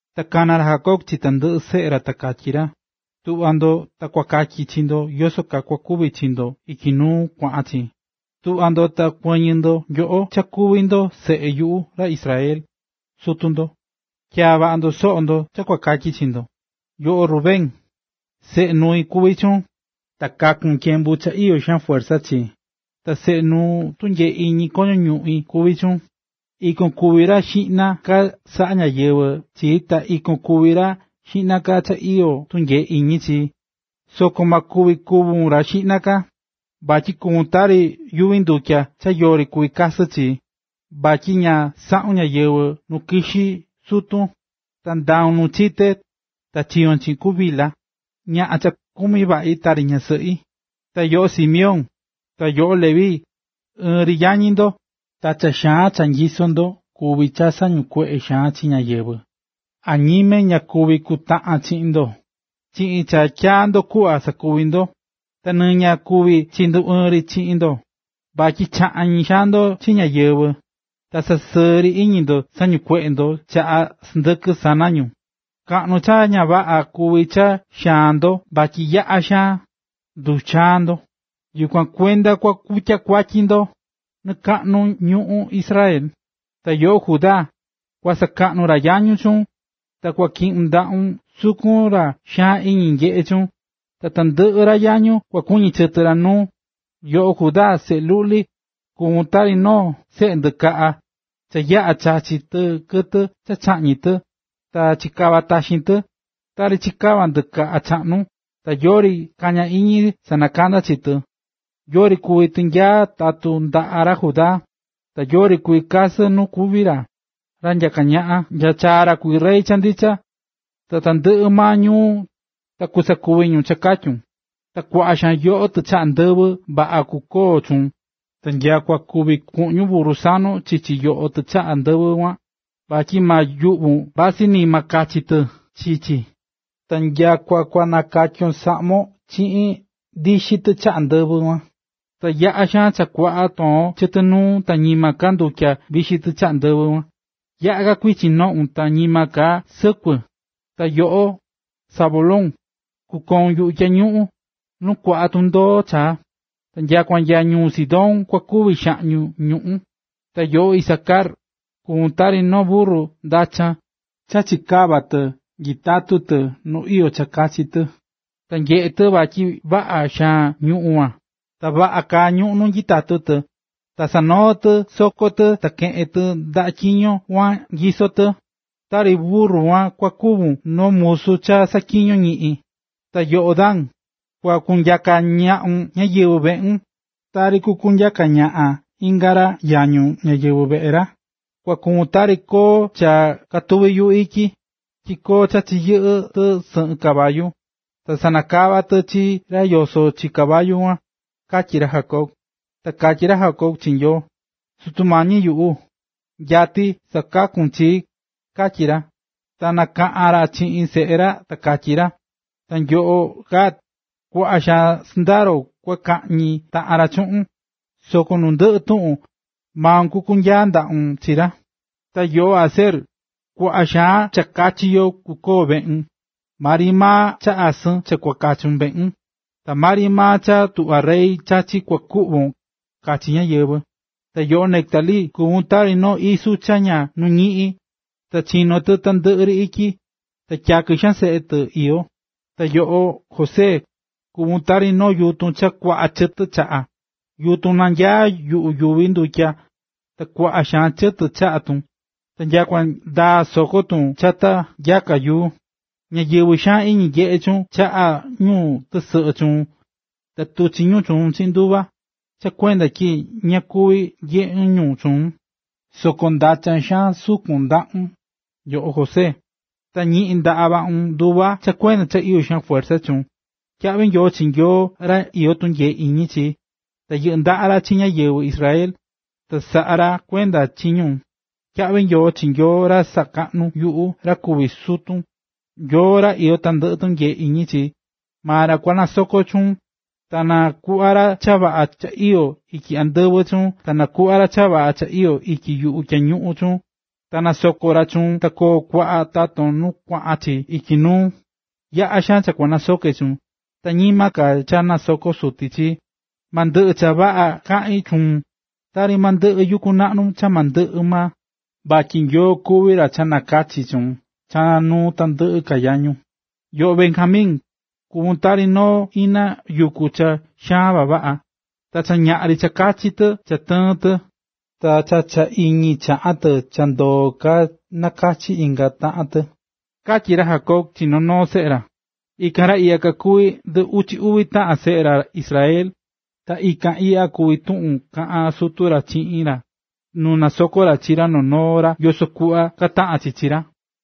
Ta kana̱ ra Jacob chi tandɨꞌɨ seꞌe ra ta katyí ra: “Tuꞌva ndo ta kua katyi chi ndo yoso kaa kua kuvi chi ndo ityi nu kuaꞌan ka chi. ”Tu̱ꞌva ndo ta kuɨ̱ñɨ nyoꞌo cha kuví ndo seꞌe yuꞌu ra Israel, sutu ndo. Tyaa̱ vaꞌa ndo soꞌo ndo cha kua katyi chi ndo. ”Yoꞌo, Rubén, seꞌe nui kuví chuun, ta kaku̱n tyembu cha iyó xaan fuerza chii, ta seꞌe nuu tunyee iñi koño ñuꞌín kuví chuun. Ikon kuví ra xiꞌna ka saꞌa ñáyɨvɨ chi ta ikon kuvi ra xiꞌna ka cha iyó tunyee iñi chi. Soko ma kuvi kuvun ra xiꞌna ka, vatyi kuvún tari yuvi ndutya cha yori kuvi kasɨ chi, vatyi ña saꞌu̱n ñáyɨvɨ nu kixí sutun, ta ndau̱n nu chite ta chiyo̱n chiꞌin ku Bilha, ñaꞌan cha kumí vaꞌi tari ñasɨꞌi. ”Ta yoꞌo, Simeón, ta yoꞌo, Leví, ɨɨn ri yañi ndo, ta cha xaan cha nyisó ndo kuví cha sañukueꞌé xaan chi ñáyɨvɨ. Añime ña kuñí chi kutaꞌan chi chiꞌin ndo, chiꞌin cha tyaá ndo kuꞌva sakuvi ndo. Ta nɨ ña kuñí chi nduɨɨn ri chi chiꞌin ndo, vatyi chaꞌñi̱ xaan ndo chi ñáyɨvɨ. Ta cha sɨɨ ri iñi ndo sañikueꞌe̱ ndo chaꞌa sɨndɨkɨ sana ñu. Kaꞌnu cha ña vaꞌa kuví cha xaan ndo vatyi yaꞌa xaan nduxaan ndo. Yukuan kuenda kua kutya kuatyi chi ndo nɨkakaꞌnu ñuꞌún Israel. ”Ta yoꞌo, Judá, kua sakaꞌnu ra yañun chuun; ta kua kɨꞌɨ ndaꞌun sukun ra xaan iñi nyeꞌé chuun, ta tandɨꞌɨ ra yañun kua kuɨñɨ chɨtɨ ra nuun. Yoꞌo, Judá, seꞌe luꞌli, kuvún tari noo seꞌe ndɨkaꞌa, cha yaꞌa chachi̱ tɨ kɨtɨ cha chaꞌñi̱ tɨ, ta chikava̱ taxin tɨ, tari chikava̱ ndɨkaꞌa chaꞌnu, ta yori kañá iñi sanakanda chi tɨ. Yori kuvi tinyaa tatun ndaꞌá ra Judá, ta yori kuvi kasɨ nu kuvi ra, ra nyaka ñaꞌan, nya chaa ra kuvi Rey cha ndicha. Ta tandɨꞌɨ maa ñuu ta kusakuvi ñu cha katyí ra. Ta kuaꞌa xaan yoꞌo tichaꞌa ndɨvɨ vaꞌa kukoo chuun, ta nyakua kuvi kuꞌñun burru sanon chichi yoꞌo tichaꞌa ndɨvɨ kuan, vatyi ma yuꞌvun vasɨ ni maa kachi tɨ chi chi. Ta nyakua kua nakatyon saꞌmon chiꞌin ndixi tichaꞌa ndɨvɨ kuan. Ta yaꞌa xaan cha kuaꞌa toon chɨtɨ nuun ta ñima ka ndutya vixi tichaꞌa ndɨvɨ; ta yaꞌa̱ ka kuichin noꞌun ta ñima ka sɨkuɨ. ”Ta yoꞌo, Zabulón, kukoun yuꞌu tyañuꞌun, nu kuaꞌa tundoo chaá. Ta nyakua nya ñuu Sidón kua kuvi xaꞌñi ñuꞌún. ”Ta yoꞌo, Isacar, kuvún tari noo burru ndachan cha chikavá tɨ nyitatú tɨ nu iyó cha kachi tɨ. Ta nyeꞌé tɨ vatyi vaꞌa xaan ñuꞌún kuan, ta vaꞌa kaá ñuꞌún kuan nu nyitatú tɨ, ta sanoo̱ tɨ soko tɨ ta keꞌe̱n tɨ ndaꞌa tyiño kuan nyisó tɨ. Tari burru kuan kua kuvun noo musu cha saꞌatyiñó ñiꞌin. ”Ta yoꞌo, Dan, kua kunyaka ñaꞌun ñáyɨvɨ veꞌun, tari kukunyaka ñaꞌan inga ra yañun ñáyɨvɨ veꞌe ra. Kua kuvun tari koo cha katuví yuꞌu ityi, tyi koo chachiyɨꞌɨ́ tɨ sɨyɨ caballua, ta sanakavá tɨ chi ra yosó chi caballu kuan”, katyí ra Jacob. Ta katyí ra Jacob chi Nyoo: “¡Sutu Mañi yuꞌu!, nyatí cha sakakún chii”, katyí ra. Ta kaꞌán ka ra chiꞌin seꞌe ra ta katyí ra:”Ta yoꞌo, Gad, kuaꞌa xaan sɨndaro kua kañi taꞌan ra chuꞌun, soko nu ndɨꞌɨ tuꞌun, maun kukunyaa ndaꞌun chi ra. ”Ta yoꞌo Aser, kuaꞌa xaan cha kachi yo kukoo veꞌun, maa ri maa cha asɨn kua kachun veꞌun, ta maa ri maa cha tuꞌvá rey chachí kua kuꞌvon kachi ñáyɨvɨ. ”Ta yoꞌo Neftalí, kuvún tari noo isu cha ña nuꞌñí, ta chinó tɨ tandɨꞌɨ ri ityi, ta tyakɨ xaan seꞌe tɨ iyó. ”Ta yoꞌo, José, kuvún tari noo yutun cha kuaꞌa chɨtɨ chaꞌa, yutun nanyaá yuꞌu yuvi ndutya ta kuaꞌa xaan chɨtɨ chaꞌá tun, ta nyakua ndaá soko tun chata nyaka yuu. Ñáyɨvɨ xaan iñi nyeꞌé chuun chaꞌá ñu tɨsɨꞌɨ chuun ta tuchí ñu chuun chiꞌin nduva, cha kuenda tyi ña kuvi nyeꞌe ñu chuun. Soko ndachan xaan sukun ndaꞌun, yoꞌo José, ta yɨꞌɨ́ ndaꞌa vaꞌun nduva cha kuenda cha iyó fuerza chuun. ¡Tyaꞌvi Nyoo chi Nyoo ra iyó tunyee iñi chi, ra yɨꞌɨ́ ndaꞌa chi ñáyɨvɨ Israel, ta saꞌá kuenda ra chi ñu! ¡Tyaꞌvi nyoo chi Nyoo, ra sakaꞌnú yuꞌu ra kuví sutun, Nyoo ra iyó tandɨꞌɨ tunyee iñi chi, maa ra kua nasoko chuun! ¡Ta na kuꞌva ra cha vaꞌa cha iyó ityi andɨvɨ chuun! ¡Ta na kuꞌva ra cha vaꞌa cha iyó ityi yuvi tyañuꞌun chuun! ¡Ta na nasoko ra chuun na koo kuaꞌa taton nu kuaꞌan chi ityi nuu! Yaꞌa̱ xaan ka cha kuaꞌa nasoké chuun, ta ñima ka cha nasoko̱ suti chii, ma ndɨꞌɨ cha vaꞌa chaꞌí chuun tari ma ndɨꞌɨ yuku naꞌnu cha ma ndɨꞌɨ maa, vatyi Nyoo kuví ra cha nakachí chuun cha nuu tandɨꞌɨ ka yañun. ”Ta yoꞌo, Benjamin, kuvún tari noo ina yuku cha xaan vavaꞌa, ta cha ñaꞌan ri chachí tɨ kɨtɨ cha tɨɨ̱n tɨ, ta cha cha iñi chaꞌa̱ tɨ cha ndoo̱ ka nakachi̱ inga taꞌan tɨ”, katyí ra Jacob chi noo noo seꞌe ra. Ikan ra iꞌya kakuví ndɨ uchi uvi taꞌan seꞌe ra Israel, ta ikan iꞌya kuví tuꞌun kaꞌa̱n sutu ra chiꞌin ra, nu nasokó ra chi noo noo ra yoso kuꞌva kataꞌan chi chi ra.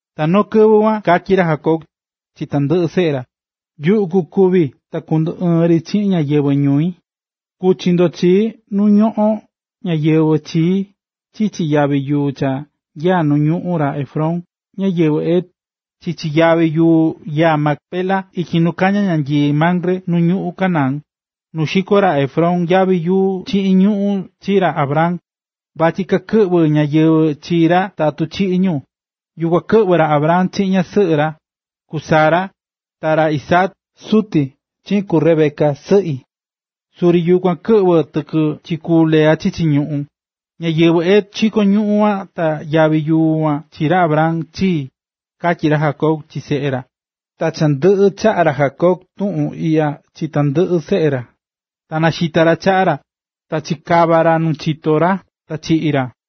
Ta noo kɨvɨ kuan, katyí ra Jacob chi tandɨꞌɨ seꞌe ra: “Yuꞌu kukúvi ta kunduɨɨn ri chiꞌin ñáyɨvɨ ñui, ku̱chi ndo chii nu ñoꞌón ñáyɨvɨ chii chichi yavi yuu cha nyaá nu ñuꞌún ra Efrón, ñáyɨvɨ Het, chichi yavi yuu nyaá Macpela ityi nu kañá ñanyii Mamre nu ñuꞌún Canaán, nu xiko̱ ra Efrón yavi yuu chiꞌin ñuꞌún chi ra Abraham, vatyi kakɨꞌvɨ ñáyɨvɨ chi ra tatu chiꞌi̱ ñu. Yukuan kɨꞌvɨ̱ ra Abraham chiꞌin ñasɨꞌɨ ra, ku Sara, ta ra Isaac, suti, chiꞌin ku Rebeca, sɨꞌi. Suri yukuan tyiꞌi̱ tiki chi ku Lea chichi ñuꞌún. Ñáyɨvɨ Het xiko̱ ñuꞌún kuan ta yavi yuu kuan chi ra Abraham, chii”, katyí ra Jacob chi seꞌe ra. Ta cha ndɨꞌɨ chaꞌa̱ ra Jacob tuꞌun iꞌya chi tandɨꞌɨ seꞌe ra, ta naxita̱ ra chaꞌa ra, ta chikava̱ ra nu chito ra, ta chiꞌi̱ ra.